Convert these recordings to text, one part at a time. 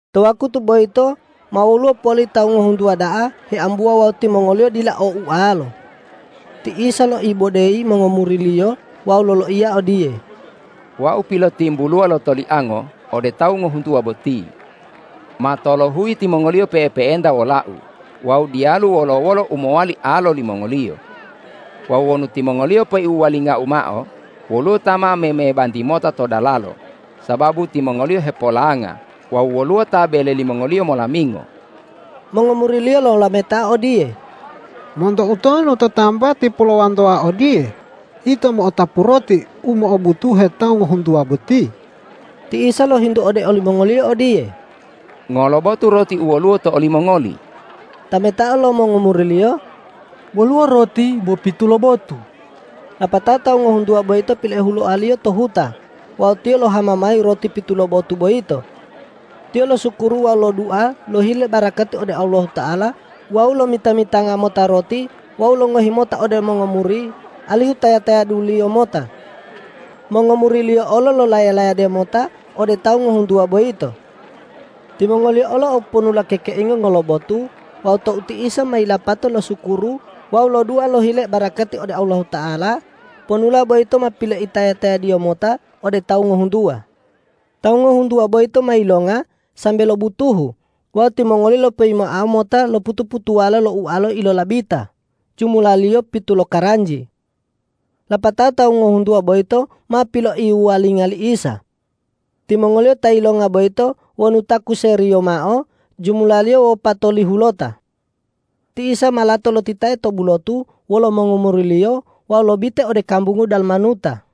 To wakutu boyito ma woluwo poli tawu ngohuntuwa da'a heambuwa wawu timongoliyo dila o ualo. Ti Isa loibodeyi mongomuri-Liyo wawu loloiya odiye, ”Wau pilotimbuluwa lo toliango ode tawu ngohuntuwa boti. Ma tolohuyi timongoliyo pe'epe'enta wola-U wawu diyalu wolo-wolo u mowali alo limongoliyo. Wawu wonu timongoliyo peipohuwalinga-U mao, woluwo ta ma memebanti mota to dalalo, sababu timongoliyo hepolanga wawu woluwo ta bele limongoliyo molamingo.” Mongomuri-Liyo lolametao odiye,”Monto utonu to tambati polowantoa odiye ito mo'otapu roti u mo'obutuhe tawu ngohuntuwa boti?” Ti Isa lohintu ode olimongoliyo odiye,”Ngolo botu roti u woluwo to olimongoli?” Tametao lo mongomuri-Liyo,”Woluwo roti bo pitu lobotu.” Lapatao tawu ngohuntuwa boyito piloihuloa-Liyo to huta wawu Tiyo lohama mayi roti pitu lobotu boyito. Tiyo losukuru wawu lodua lohile barakati ode Allahuta'ala wawu lomita-mitanga mota roti wawu longohi mota ode mongomuri alihu taya-tayaduliyo mota. Mongomuri-Liyo olo lolaya-layade mota ode tawu ngohuntuwa boyito. Timongoliyo olo o ponula kekeinga ngolobotu wawu tou ti Isa ma yilapato losukuru wawu lodua lohile barakati ode Allahuta'ala, ponula boyito ma piloitaya-tayad-Iyo mota ode tawu ngohuntuwa. Tawu ngohuntuwa boyito ma yilonga sambe lobutuhu wawu timongoliyo lopoyimoa mota lo putu-putuwala lo ualo ilolabita, jumulaliyo pitu lokaranji. Lapatao tawu ngohuntuwa boyito ma piloiwuwalinga li Isa. Timongoliyo ta yilonga boyito wonu takuseriyo mao, jumulaliyo wopatolihulota. Ti Isa ma lato lotitae to bulotu wolo mongomuri-Liyo wawu lobite ode kambungu Dalmanuta.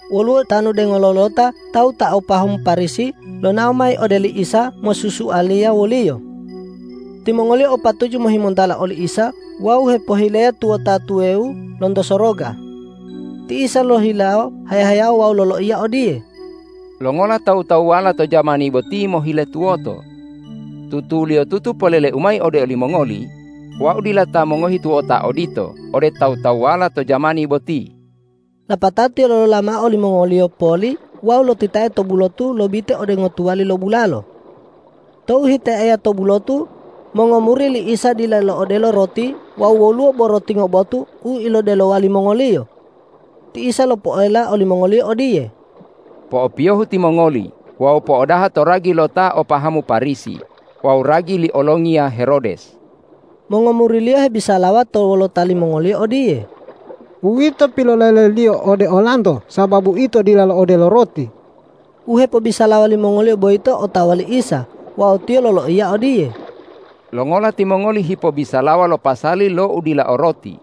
Woluwo tanu dengolo lo ta tawu ta o pahamu Parisi lonao mayi ode li Isa mosusualiya wo-Liyo. Timongoliyo o patuju mohimontala oli Isa wawu hipohileya tuwota tuwawu lonto soroga. Ti Isa lohilawo haya-haya wawu loloiya odiye,”Longola tawu-tawuwala to jamani boti mohile tuwoto? Tutuliyotutu polele-U mayi ode olimongoli: Wau dila ta mongohi tuwota odito ode tawu-tawuwala to jamani boti.” Lapatao Tiyo lolola mao olimongoliyo poli wawu lotitae to bulotu lobite ode ngotuwali lo bulalo. Tou hitaeya to bulotu, mongomuri li Isa dila lo'odelo roti wawu woluwo bo roti ngobotu u ilodelowa limongoliyo. Ti Isa lopoela olimongoliyo odiye,”Po'opiyohu timongoli wawu po'odaha to ragi lo ta o pahamu Parisi wawu ragi li olongiya Herodes.” Mongomuri-Liyo hebisalawa to wolota limongoliyo odiye,”Uwito pilolele-Liyo ode olanto sababu ito dila lo'odelo roti.” U hepobisalawa limongoliyo boyito otawa li Isa wawu Tiyo loloiya odiye,”Longola timongoli hipobisalawa lo pasali lo udila o roti?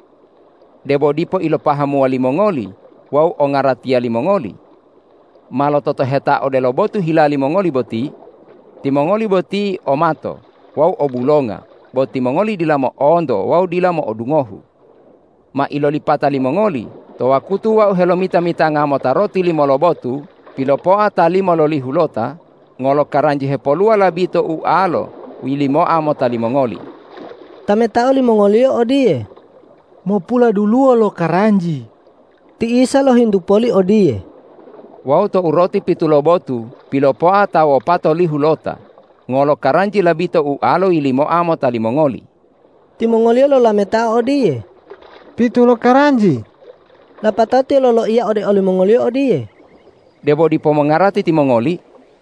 Debo dipo ilopahamuwa limongoli wawu ongaratiya limongoli? Ma lototoheta odelo botu hila limongoli boti. Timongoli boti o mato wawu o bulonga, bo timongoli dila mo'onto wawu dila mo'odungohu. Ma ilolipata limongoli to wakutu Wau helomita-mitanga mota roti limo lobotu pilopoa ta limololihulota, ngolo karanji hepoluwa labito ualo yilimoa mota limongoli?” Tametao limongoliyo odiye,”Mopuladuluwo lokaranji.” Ti Isa lohintu poli odiye,”Wawu tou roti pitu lobotu pilopoa ta wopatolihulota, ngolo karanji labito ualo yilimoa mota limongoli?” Timongoliyo lolametao odiye,”Pitu lokaranji.” Lapatao Tiyo loloiya ode olimongoliyo odiye,”Debo dipo mongarati timongoli?”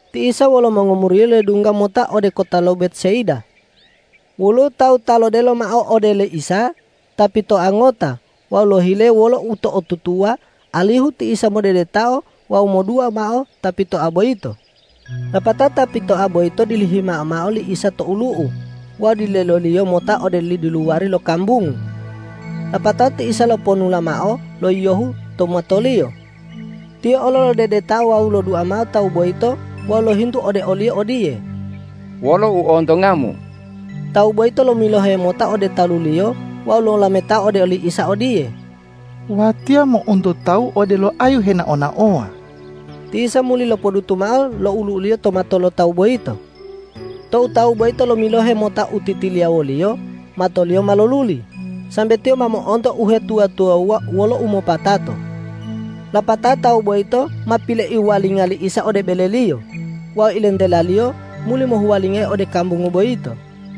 Ti Isa wolo mongomuri-Liyo ledungga mota ode kota lo Betsaida. Woluwo tawu ta lodelo mao ode li Isa, ta pitoa ngota wawu lohile wolo uto'otutuwa alihu ti Isa modedetao wawu modua mao ta pitoa boyito. Lapatao ta pitoa boyito dilihima mao li Isa to olu'u wawu dilede-Iyo mota ode diluwari lo kambungu. Lapatao ti Isa loponula mao lo yiyohu to matoliyo. Tiyo olo lodedetao wawu lodua mao tawu boyito wawu lohintu ode oliyo odiye,”Wolo u ontongamu?” Tawu boyito lomilohe mota ode taluliyo wawu lolametao ode oli Isa odiye,”Watiya mo'onto tawu odelo ayu henao-naowa.” Ti Isa muli lopodutu mao lo olu'u-Liyo to mato lo tawu boyito. Tou tawu boyito lomilohe mota u titiliya woliyo, matoliyo ma loluli, sambe tiyo ma mo'onto uhetuwa-tuwawuwa wolo umopatato. Lapatao tawu boyito ma piloiwuwalinga li Isa ode beleliyo wawu ilentela-Liyo muli mohuwalingayi ode kambungu boyito.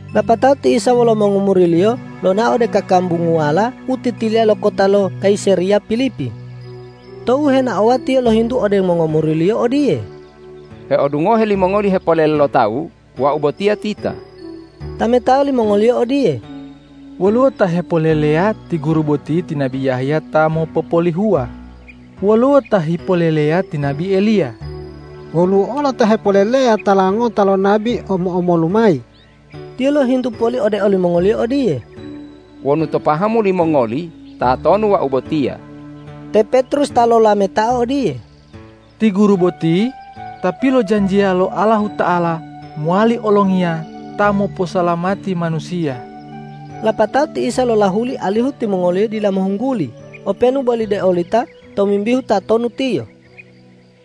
Lapatao ti Isa wolo mongomuri-Liyo lonao ode kakambunguwala u titiliya lo kota lo Kayisareya Pilipi. Tou henaowa Tiyo lohintu ode mongomuri-Liyo odiye,”Heodungohe limongoli hepolele lo tawu, Wau botiya tita?” Tametao limongoliyo odiye,”Woluwo ta hepoleleya ti Guru boti ti nabi Yahya ta mopopolihuwa, woluwo ta hipoleleya ti nabi Eliya, woluwo olo ta hepoleleya tala ngota lo nabi omo-omolu mayi.” Tiyo lohintu poli ode olimongoliyo odiye,”Wonu to pahamu limongoli, tatonu Wau botiya?” Te Petrus ta lolametao odiye,”Ti Guru boti Ta pilojanjiya lo Allahuta'ala mowali olongiya ta moposalamati manusiya!” Lapatao ti Isa lolahuli alihu timongoliyo dila mohungguli openu boli deolita tomimbihu tatonu Tiyo.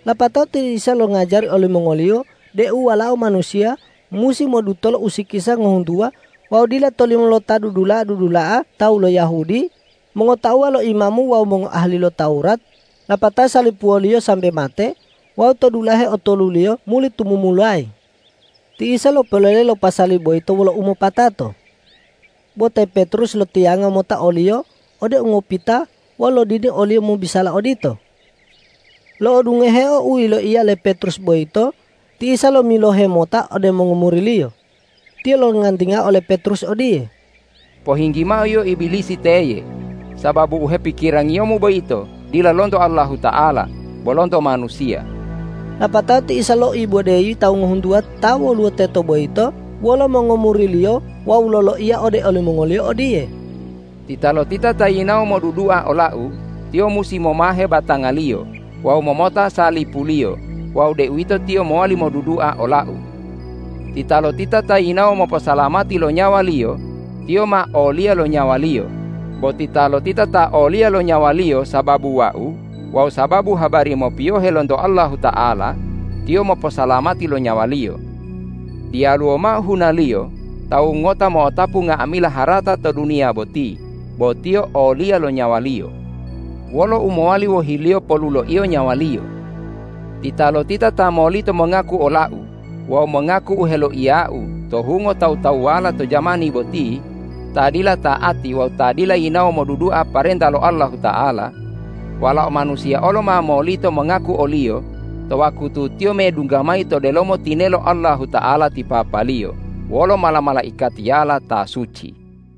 Lapatao ti Isa longajari olimongoliyo deu Walao Manusiya musi modutola usikisa ngohuntuwa wawu dila tolimo lo ta dudula'a-dudula'a tawu lo Yahudi, mongotauwa lo imamu wawu mongoahali lo Tawurat, lapatao salipuwoliyo sambe mate wawu to dulahe otoluliyo muli tumumulayi. Ti Isa lopolele lo pasali boyito wolo umopatato. Bo te Petrus lotiyanga mota o-Liyo ode ungopita wawu lodini o-Liyo mobisala odito. Lo'odungoheo u yiloiya le Petrus boyito ti Isa lomilohe mota ode mongomuri-Liyo. Tiyo longantingao ole Petrus odiye,”Pohinggi mao yio Ibilisi teye, sababu u hepikirangiyomu boyito dila lonto Allahuta'ala, bo lonto manusiya.” Lapatao ti Isa loibodeyi tawu ngohuntuwa ta woluwo teto boyito wolo mongomuri-Liyo wawu loloiya ode olimongoliyo odiye,”Titalotita ta yinawo modudua ola-U, tiyo musi momahe batangaliyo wawu momota salipuliyo wawu deuwito tiyo mowali modudua ola-U. Titalotita ta yinawo moposalamati lo nyawaliyo, tiyo ma oliya lo nyawaliyo; bo titalotita ta oliya lo nyawaliyo sababu Wau wawu sababu habari mopiyohe lonto Allahuta'ala, tiyo moposalamati lo nyawaliyo. Diyaluwo mao hunaliyo tawu ngota mo'otapu nga'amila harata to duniya boti, bo tiyo oliya lo nyawaliyo. Wolo u mowali wohiliyo poluloiyo nyawaliyo? Titalotita ta molito mongaku ola-U wawu mongaku u heloiya-U to hungo tawu-tawuwala to jamani boti ta dila ta'ati wawu ta dila yinawo modudua parenta lo Allahuta'ala, Walao Manusiya olo ma molito mongaku oliyo to wakutu Tiyo medungga mayi to delomo tinelo Allahuta'ala ti Papa-Liyo wolo mala-malaikatiyala ta suci.”